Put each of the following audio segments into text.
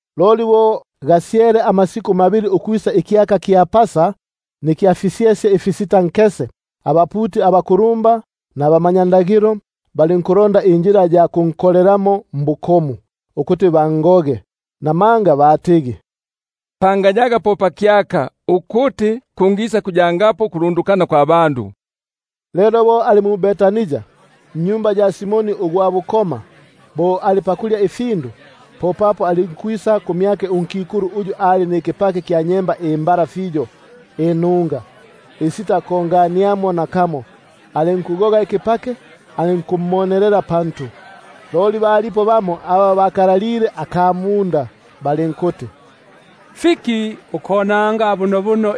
Loli gasyele amasiku mabili ukwisa ikyaka kya Pasa nikya fisyesye ifisitankese. Popapo abaputi abakulumba, nabamanyakalata balinkulonda injila ya kunkolelamo mbukomu, ukuti bangoge. Namanga batigi: Pangayaga po pakyaka, ukuti kungisakuyapo ukulundukana kwa bandu. Lelo bo ali mu-Betania nnyumba ya Simoni ugwa bukoma, bo ali pakulya, alinkwisa kumyake unkikulu, uyu ali nikipake kya nyemba imbala fiyo inunga, isitakongania nakamo, alinku- goga ikipake alinkumonelela pantu. Loli balipo bamo aba bakalalile aka munda, balinkuti: Fiki ukonanga bunobuno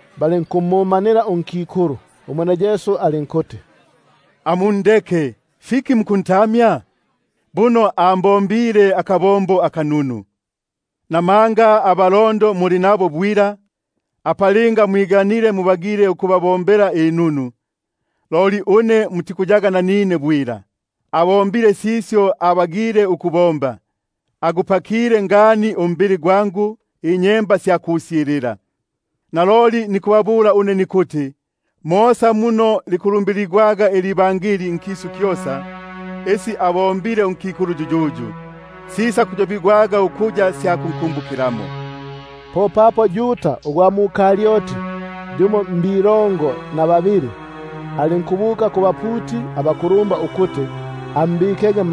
Balinkumumanila unkikulu. Umwene Yesu alinkuti: Amundeke, fiki mukuntamya? Buno ambombile akabombo aka- nunu; namanga abalondo muli nabo bwila, apa linga mwiganile, mubagile ukubabombela inunu, loli une mutikuyaga nanine bwila. Abombile sisyo abagile ukubomba, agupakile ngani umbili gwangu inyemba sya kusyilila. Naloli nikubabula une nikuti, mosa muno likulumbiligwaga nIbangeli nkisu kyosa, isi abombile unkikulu yuyuyu, sisakuyobigwaga ukuya sya kunkumbukilamo. Popapo Yuda ugwa mu-Karioti, yumo mbakalongo na babili bala, alinkubuka kubaputi abakulumba ukuti ambikege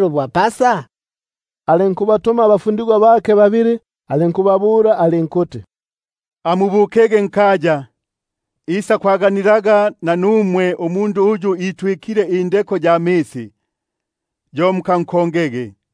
bwa Pasa? Alinkubatuma abafundigwa bake babili, alinkubabula alinkuti: Amubukege nkaya, isakwaganilaga nanumwe umundu uyu apimbile indeko ya misi; yo mukankongege,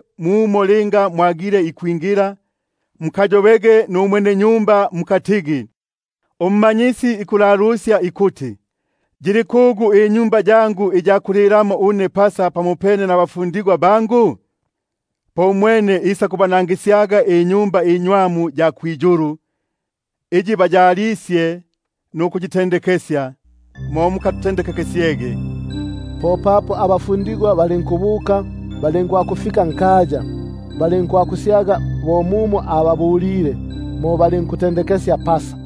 muno mwagile ikwingila, mukayobege numwenenyumba mukatigi: uMmanyisi ikuti: Yili kugu inyumba yangu iya kulilamo une Pasa pamopene nabafundigwa bangu? Umwene isakubanangisyaga inyumba inywamu ya kwiyulu, iyi baya- lisye nukuyitendekesya; mo mukatutendekekesyege. Popapo abafundigwa balinkubuka, balinkwakufika nkaya, balinkwakusyaga bo mumo ababulile, mo balinkutendekesya Pasa.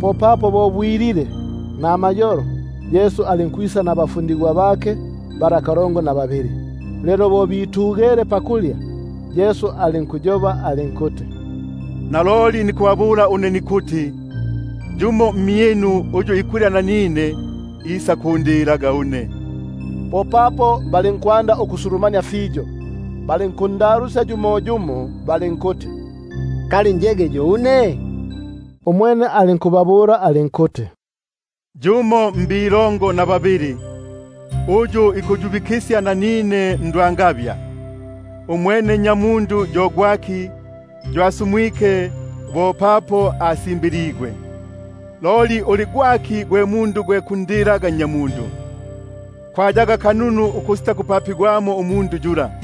Popapo lelo namayolo alinkwisa nabo kalongo na babili bala. Lelo bo bitugele pakulya, Yesu alinkuti: Naloli nikubabula une nikuti, yumo mmyinu uyu ikulya nanine, isakumbikaga mmaboko ga balugu. Popapo balinkwanda ukusulumania, balinkuyoba nagwe yumoyumo balinkuti: Kali njege yo une? Umwene alinkubabula alinkuti: Yumo mbakalongo na babili, uyu ikuyubikisya nanine ndwangabya. Nnyamundu yo asumwike bo papo asimbiligwe, loli hitata kumundu uyu ikumbikaga Nnyamundu mmaboko ga balugu! Kwayaga kununu ukusitakupapigwamo umundu yula.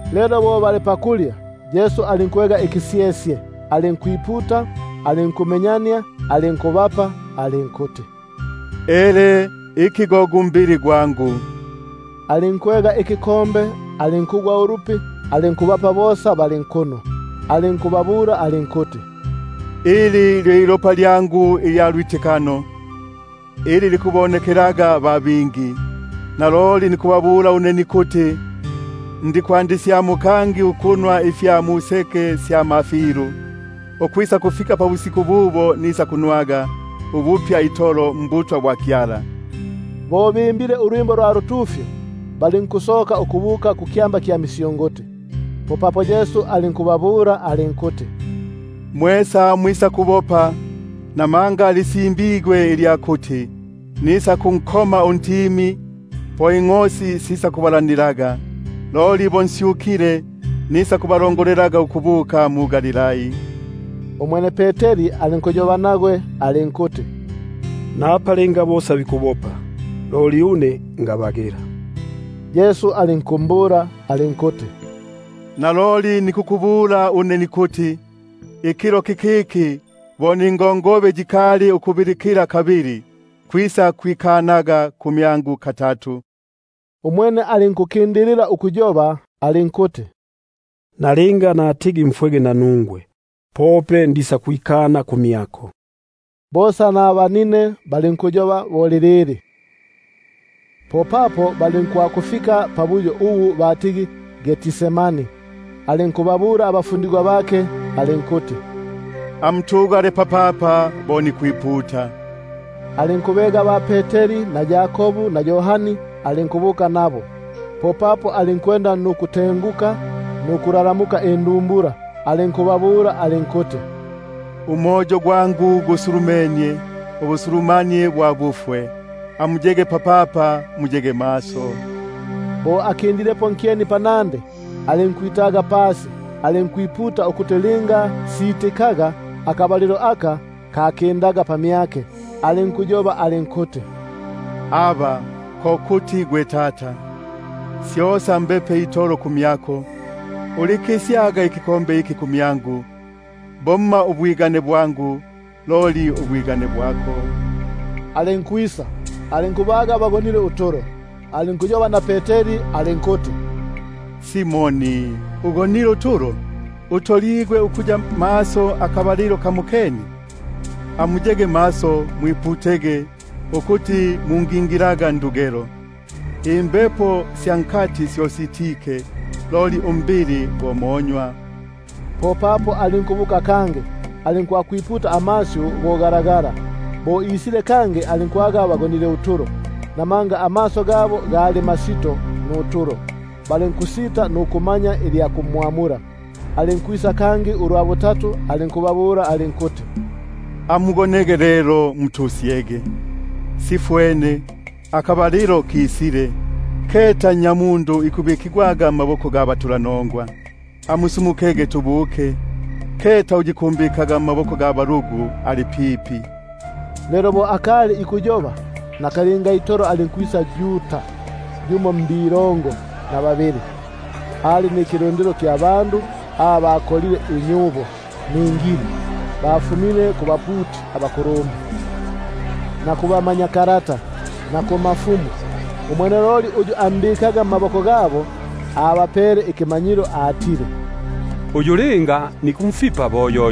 Lelo bo bali pakulya, alinkwega ikisyesye, alinkwiputa, alinkukimenyania, alinkubapa alinkuti: Ele, iki go gu mbili gwangu. Alinkwega ikinwelo, alinkugwa ulupi, alinkubapa, bosa balinkunwelamo. Alinkubabula alinkuti: Iki lyo ilopa lyangu ilya lwitikano, ili likubonekelaga ba bingi. Naloli nikubabula une nikuti, ndisakwandisyamo ukunwa ifya museke sya mafilu, ukwisakufika pisiku ili nisakunwaga ifipya mbutwa bwa Kyala. Bo bimbile ulwimbo lwa lutufyo, balinkusoka ukubuka kukyamba kya misyunguti. Popapo Yesu alinkubabula alinkuti: Mwesa mwisakwikinya, namanga lisimbigwe ilya kuti: Nisakunkoma untimi, po ingʼosi sisakunyambanikaga. Loli bo nsyukile, nisakuba- longolelangapo ukubuka mu-Galilai. Umwene Peteri alinkuyoba nagwe alinkuti: Napa linga bosa bikwikinya, loli une ngabagila. Yesu alinkumbula alinkuti: Naloli nikukubula une nikuti, ikilo kikiki, bo ningongobe yikali ukubilikila kabili, kwisakwikana kumyangu katatu. Umwene alinkukindililapo ukuyoba alinkuti: Nalinga natigi mfwege nanungwe, pope ndisakwikana kumyako. Bosa nabanine balinkuyoba bo lilili. Popapo balinkwakufika pabuyo ubu batigi Getsemani; alinkubabula abafundigwa bake alinkuti: Amutugale papapa tasi nipute. Alinkubega ba-Peteri na Yakobu na Yohani, alinkubuka nabo. Popapo alinkwanda ukutenguka nuku- lalamuka indumbula, alinkubabula alinkuti: Umoyo gwangu gusulumenie ubusulumanie bwa bufwe; amuyege papapa, muyege maso. Bo akindilepo nkyeni panandi, alinkwitaga pasi, alinkwiputa ukuti linga sitikaga, akabalilo aka kanki- ndaga, alinkuti: Abba, Tata, syosa mbepe itolo kumyako; ulikikisyaga ikinwelo iki kumyangu; bomma ubwigane bwangu, loli ubwako. Alinkwisa, alinkubaga bagonile utulo; alinkuyoba na Peteri alinkuti: Simoni, ugonile utulo? Utoligwe ukuya maso akabalilo kamokene? Amuyege maso mwiputege, ukuti mungingilaga ndugelo; imbepo sya nkati syo sitike, loli umbili go monywa. Popapo alinkubuka kangi, alinkwakwiputa gago. Bo isile kangi alinkwaga bagonile utulo, namanga amaso gabo gali masito nutulo; balinkusita nukumanya ilya kumwamula. Alinkwakwisa kangi ulwa butatu, alinkubabula alinkuti: Amugonege lelo mutusyege! — Simalike. Akabalilo kisile; keta Nnyamundu ikubikigwaga mmaboko ga batulanongwa. Amusumukege tubuke; keta uyu ikumbikaga mmaboko ga balugu ali pipi. Lelo bo akali ikuyoba, nakalinga itolo alinkwisa Yuda, yumo mbakalongo na babili, ali nikilundilo kya bandu aba bakolile inyubo ningili; bafumile kubaputi abakulumba, na kuba- manyakalata, na kubakulumba. Uyu ambikaga mmaboko gabo, abapele ikimanyilo atile: Uyu linga nikumfipa bo yo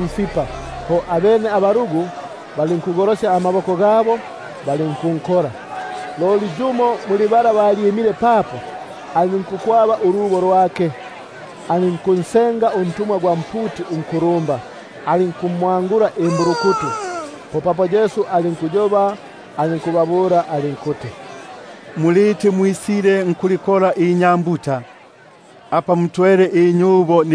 mfipa. Abene balinkugolosya amaboko balinkunkola. Yumo muli aba balyimile papo, alinkukwaba ulubo lwake, alinkunsenga untumwa gwa mputi unkulumba, alinkumwa- ngula imbulukutu. Popapo Yesu alinkubamula alinkuti: Muliti mwisile nkulikola inyambuta, apa mutwele inyubo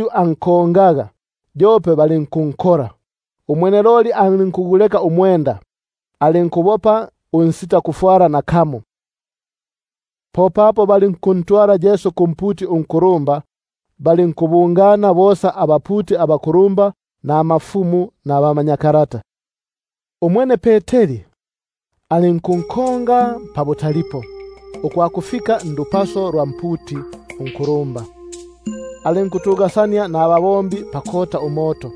alinkunkonga, yope balinkunkola; umwene loli alinkuguleka umwenda, alinkubopa unsitakufwala nakamo. Popapo balinkuntwala Yesu kumputi unkulumba; balinkubungana bosa abaputi abakulumba, nabandu abakulumba, nabamanyakalata. Umwene Peteri alinkunkonga pabutalipo, ukwakufika ndupaso lwa mputi unkulumba; alinkutugasania nababombi pakota umoto.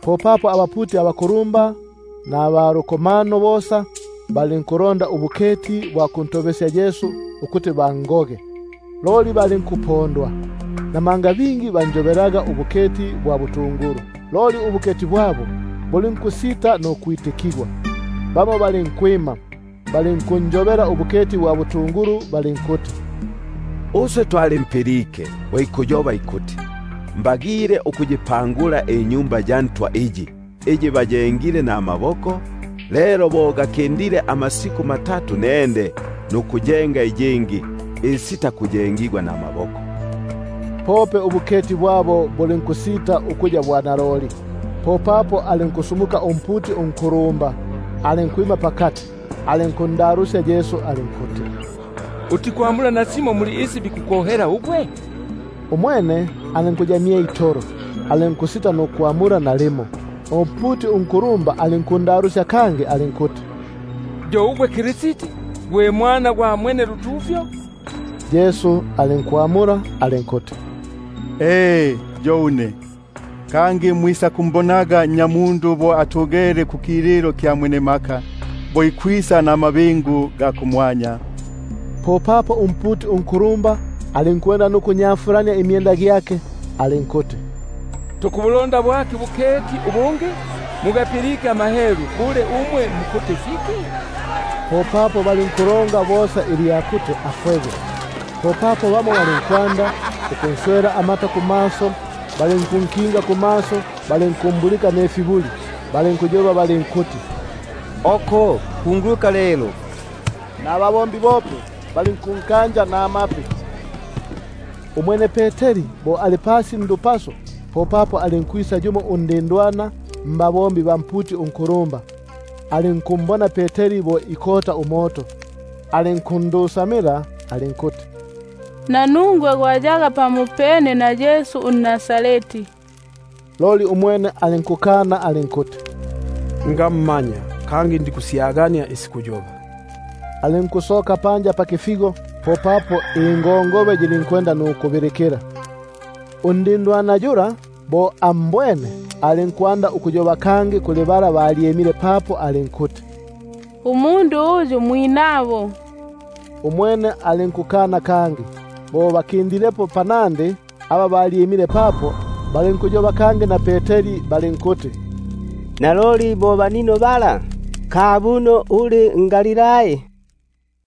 Popapo abaputi abakulumba, nabalukomano bosa balinkulonda ubuketi bwa kuntobekesya Yesu ukuti bangogege, loli balinkupondwa; namanga bingi banjobaga ubuketi bwa butungulu, loli ubuketi bwabo buli- nkusita nukwitikana. Bamo balinkwima, balinkunjobela ubu- keti bwa butungulu balinkuti: Uswe twalimpilike bo ikuti: Mbagile ukumpangula Tempeli, uyu abombigwe namaboko, kangi bo gakindile amasiku matatu nende nukunjenga uyungi unsitakubombigwa namaboko. Pope ubuketi bwabo bulinku- sita nukwitikana. Popapo alinkusumuka umputi unkulumba, alinkwima pakati, alinkundalusya Yesu alinkuti: Utikwamula nasimo muli isi bikukohela ugwe? Umwene alinkuya mye itolo alinkusita nukwamula nalimo. Umputi unkulumba alinkundalusya kangi alinkuti: Ngimba ugwe gwe Kristi uMwana gwa Mwenelutufyo? Yesu alinkuti: E, yo une, kangi mwisakumbonaga Nnyamundu atugele kukililo kya Mwenemaka, ikwisa namabingu ga kumwanya. Popapo umputi unkulumba alinkunyafulania imyenda gyake alinkuti: Tukubulonda bwaki ubuketi ubungi? Mugapilike amahelu; bule mukuti fiki umwe? Popapo balinkulonga bosa ilya kuti afwege. Popapo bamo balinkwanda ukunswela amata, balinkunkinga kumaso nukumbulika, balinkuyoba balinkuti: Oko, kunguluka lelo! Nababombi bope balinkunkoma namapi. Umwene Peteri bo ali pasi ndupaso, popapo alinkwisa yumo undindwana mbabombi ba mputi unkulumba; alinkumbona Peteri bo ikota umoto, alinkundusamila alinkuti: Nanungwe gwali pamopene na Yesu unNazareti. Loli umwene alinkukana alinkuti: Ngammanya, kangi ndikusyagania isi kuyoba. Alinkusoka panja pakifigo; po ingongobe yilinkubilikila. Undindwana yula bo ambwene, alinkwanda ukuyoba kangi kuli aba balyimile papo alinkuti: Uyu mwinabo. Umwene alinkukana kangi. Bo pakindilepo panandi, aba balyimile papo balinkuyoba kangi na Peteri balinkuti: Naloli bo banino balabala, kabuno uli nGalilai.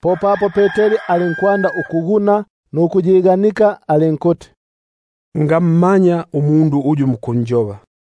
Popapo alinkwanda ukwiguna nukuyiganika alinkuti: Ngammaya umundu uyu mukunjoba.